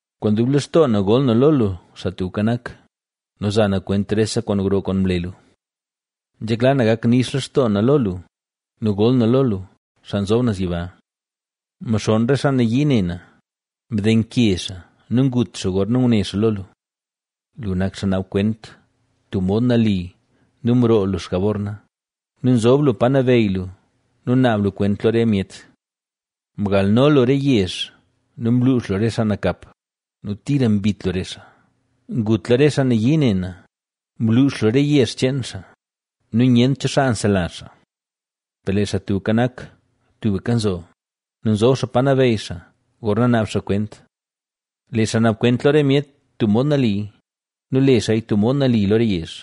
Kwaan dub lextoo na gol na lo lu, Xaa Tubka Nak, nu za na kwent rese kwaan gro kwaan mle lu. Nzhekla na gak nix lextoo na lo lu nu gol na lo lu, Xaa Nzob Naz Yiba. Mxonn re xaa nayii ne na, mdenke xaa nu ngut xaa gorna ngune xaa lo lu. Lu nak xaa naab kwent tub mod nali nu mroo lu xjabor na nu nzob lu pa nabeyy lu nu naab lu kwent lo re myet. Mgalno lu re yezh nu mluux lu re xaa nakap ¡nu tira mbit lu re xaa! Ngutla re xaa nayii ne na, mluux lu re yezh cheen xaa nu nyent cho xaa nselazh xaa. Per lee Xaa Tubka Nak tubka nzo nu nzob xaa pa nabeyy xaa, gorna naab xaa kwent. Lee xaa naab kwent lo re myet tub mod nali, nu le xaaya tub mod nali lo re yezh.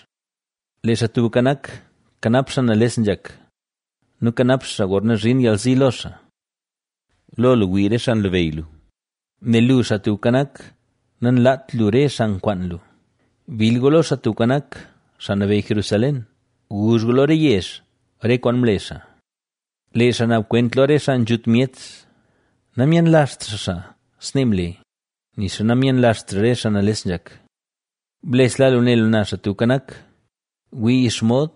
Lee Xaa Tubka Nak, kanap xaa nales nzhak, nu kanap xaa xaa gorna nzhin yalzi lo xaa. Lo lu wii re xaa nlabeyy lu, nel lu, Xaa Tubka Nak, nanlaat lu re xaa nkwaan lu. Bill gu lo Xaa Tubka Nak, xaa nabeyy Jerusalén, guzh gu lo re yezh re kwaan mle xaa. Lee xaa naab kwent lo re xaa nzhut myet, namyenlazht xaa xaa snee mle; nixa namyenlazht xaa re xaa nales nzhak. Blesla lu ne lu na, Xaa Tubka Nak, wii xomod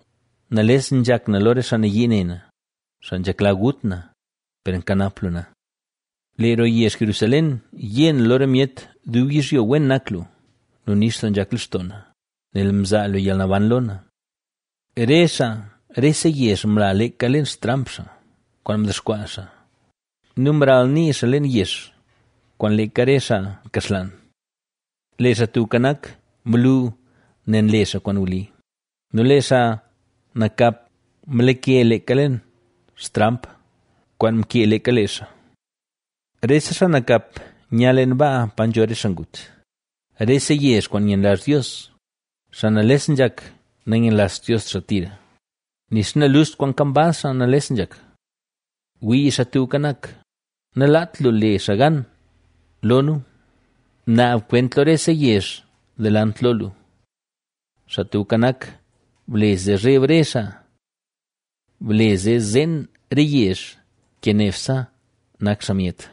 nales nzhak na lo re xaa nayii ne na, xaa nzhekla gut na, per nkanap lu na. Lee roo yezh Jerusalén, yé na lo re myet dub yizhyo wen nak lu nu nix doo nzhak lextoo na, nel mzaa lu yalnaban lo na. Re xaa rese yezh mla leeka leen xtramp xaa, kwaan mdexkwaa xaa, nu mralnii xaa leen yex, kwaan leeka re xaa mkaxlaan. Lee Xaa Tubka Nak mlu, nel nle xaa kwaan wli nu lee xaa nakap mlake leeka leen xtramp, kwaan mkee leeka lee xaa. Rese xaa nakap nya leen baa pa nzho re xaa ngut, rese yezh kwaan nyenlazh Dios. Xaa nales nzhak, nayenlazht Dios xaa tira, nixa naluxt kwaan kambaz xaa nales nzhak. Wii, Xaa Tubka Nak, nalaat lu le xaa gan lo nu; naab kwent lo rese yezh delant lo lu. Xaa Tubka Nak, ble zee zheb re xaa, ble zee zeen re yezh, ke nebse nak xaa myet.